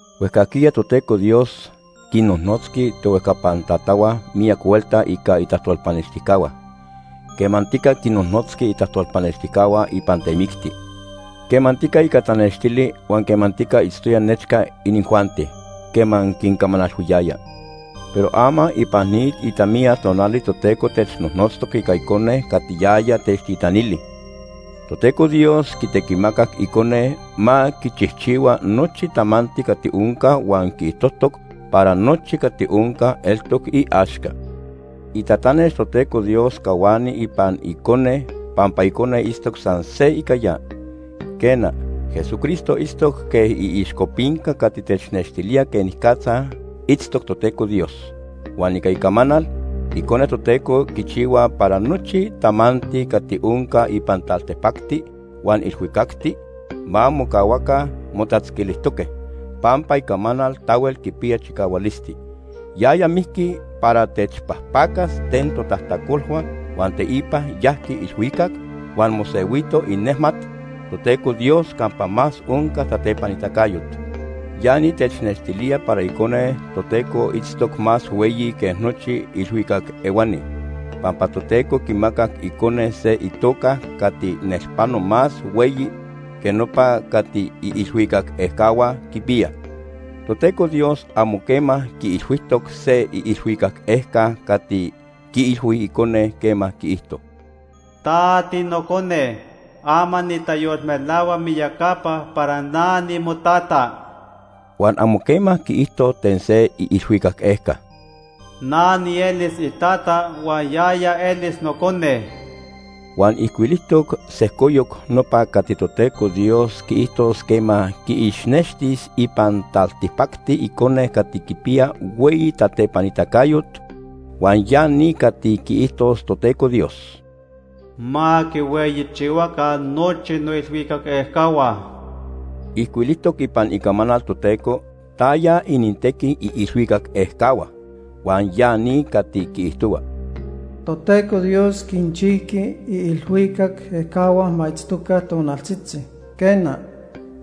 Huejcajquiya Toteco Dios quinnojnotzqui tohuejcapan tatahua miyac huelta ica itajtolpanextijcahua. Quemantica quinnojnotzqui itajtolpanextijcahua ipan temicti, quemantica ica tanextili huan quemantica itztoya nechca inijuanti quema quincamanalhuiyaya. Pero ama ipan ni itamiya tonali Toteco technojnotztoc ica Icone cati yaya techtitanili. Toteco Dios quitequimacac Icone ma quichijchihua nochi tamanti cati onca huan quiijtojtoc para nochi cati onca eltoc iaxca. Itatanex Toteco Dios cahuani ipan Icone pampa Icone itztoc san se ica ya. Quena, Jesucristo itztoc quej iixcopinca cati technextilía quenicatza itztoc Toteco Dios. Huan ica icamanal, Icone Toteco quichihua para nochi tamanti cati onca ipan taltipacti huan ilhuicacti ma mocahuaca motatzquilijtoque, pampa icamanal tahuel quipiya chicahualisti. Yaya mijqui para techpajpacas ten totajtacolhua huan teipa yajqui ilhuicac huan mosehuito inejmat Toteco Dios campa más onca tatepanitacayot. Ya ni technextilía para Icone Toteco itztoc más hueyi que nochi ilhuicac ehuani, pampa Toteco quimacac Icone se itoca O se itequiticayo. cati nelpano más hueyi que nopa cati iilhuicac ejcahua quipiyaj. Toteco Dios amo quema quiilhuijtoc se iilhuicac ejca cati quiilhui Icone quema quiijto: “Ta tiNocone. Ama nitayolmelahua miyacapa para na nimoTata.” Huan amo quema quiijto ten se iilhuicac ejca: “Na nielis iTata huan yaya elis Nocone.” Huan ijcuilijtoc sejcoyoc nopa cati Toteco Dios quiijtos quema quiixnextis ipan taltipacti Icone cati quipiya hueyi tatepanitacayot, huan ya ni cati quiijtos Toteco Dios: “Ma quihueyichihuaca nochi noilhuicac ejcahua.” Ijcuilijtoc ipan Icamanal Toteco taya inintequi iilhuicac ejcahua, huan ya ni cati quiijtohua: “Toteco Dios quinchijqui iilhuicac ejcahua ma itztoca tonaltzitzi. Quena,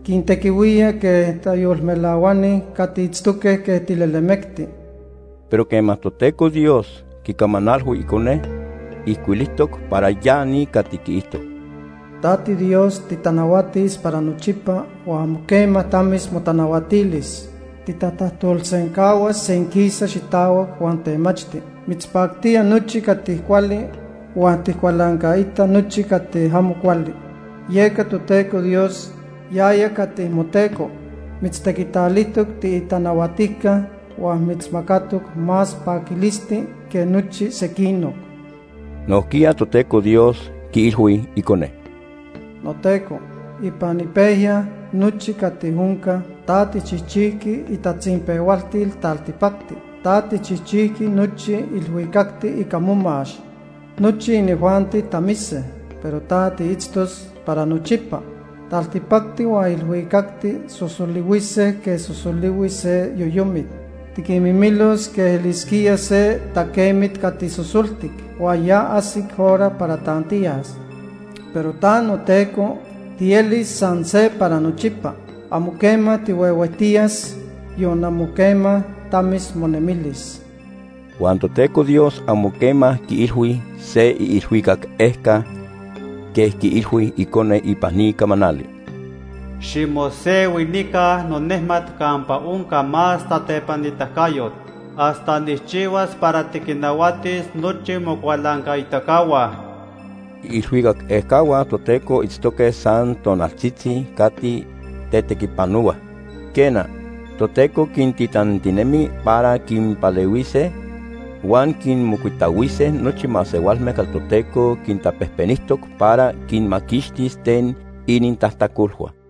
quintequihuía quej tayolmelahuani cati itztoque quej tilelemecti.” Pero quema Toteco Dios quicamanalhui Icone, ijcuilijtoc para ya ni cati quiijto: “Ta tiDios, titanahuatis para nochipa huan amo quema tamis motanahuatilis. Titatajtolsencahuas senquisa xitahuac huan temachti. Mitzpactía nochi cati cuali huan tijcualancaita nochi cati amo cuali. Yeca Toteco Dios, yaya cati moTeco, mitztequitalijtoc tiitanahuatijca huan mitzmacatoc más paquilisti que nochi sequinoc.” Nojquiya Toteco Dios quiilhui Icone: “NoTeco, ipan ipejya nochi cati onca, ta tijchijchijqui itatzinpehualtil taltipacti. Ta tijchijchijqui nochi ilhuicacti ica momax. Nochi inijuanti tamise, pero ta, tiitztos para nochipa. Taltipacti huan ilhuicacti sosolihuise quej sosolihui se yoyomit. Tiquinmimilos quej elisquía se taquemit cati sosoltic huan ya ajsic hora para tantiyas. Pero ta, noTeco, tielis san se para nochipa. Amo quema tihuehuejtiyas, yon amo quema tamis monemilis.” Huan Toteco Dios amo quema quiilhui se iilhuicac ejca quej quiilhui Icone ipan ni camanali: “Ximosehui nica nonejmat campa onca más tatepanitacayot, hasta nijchihuas para tiquinnahuatis nochi mocualancaitacahua.” Iilhuicac ejcahua Toteco itztoque san tonaltzitzi cati tetequipanohuaj. Quena, Toteco quintitantinemi para quinpalehuise huan quinmocuitahuise nochi masehualme cati Toteco quintapejpenijtoc para quinmaquixtis ten inintajtacolhua.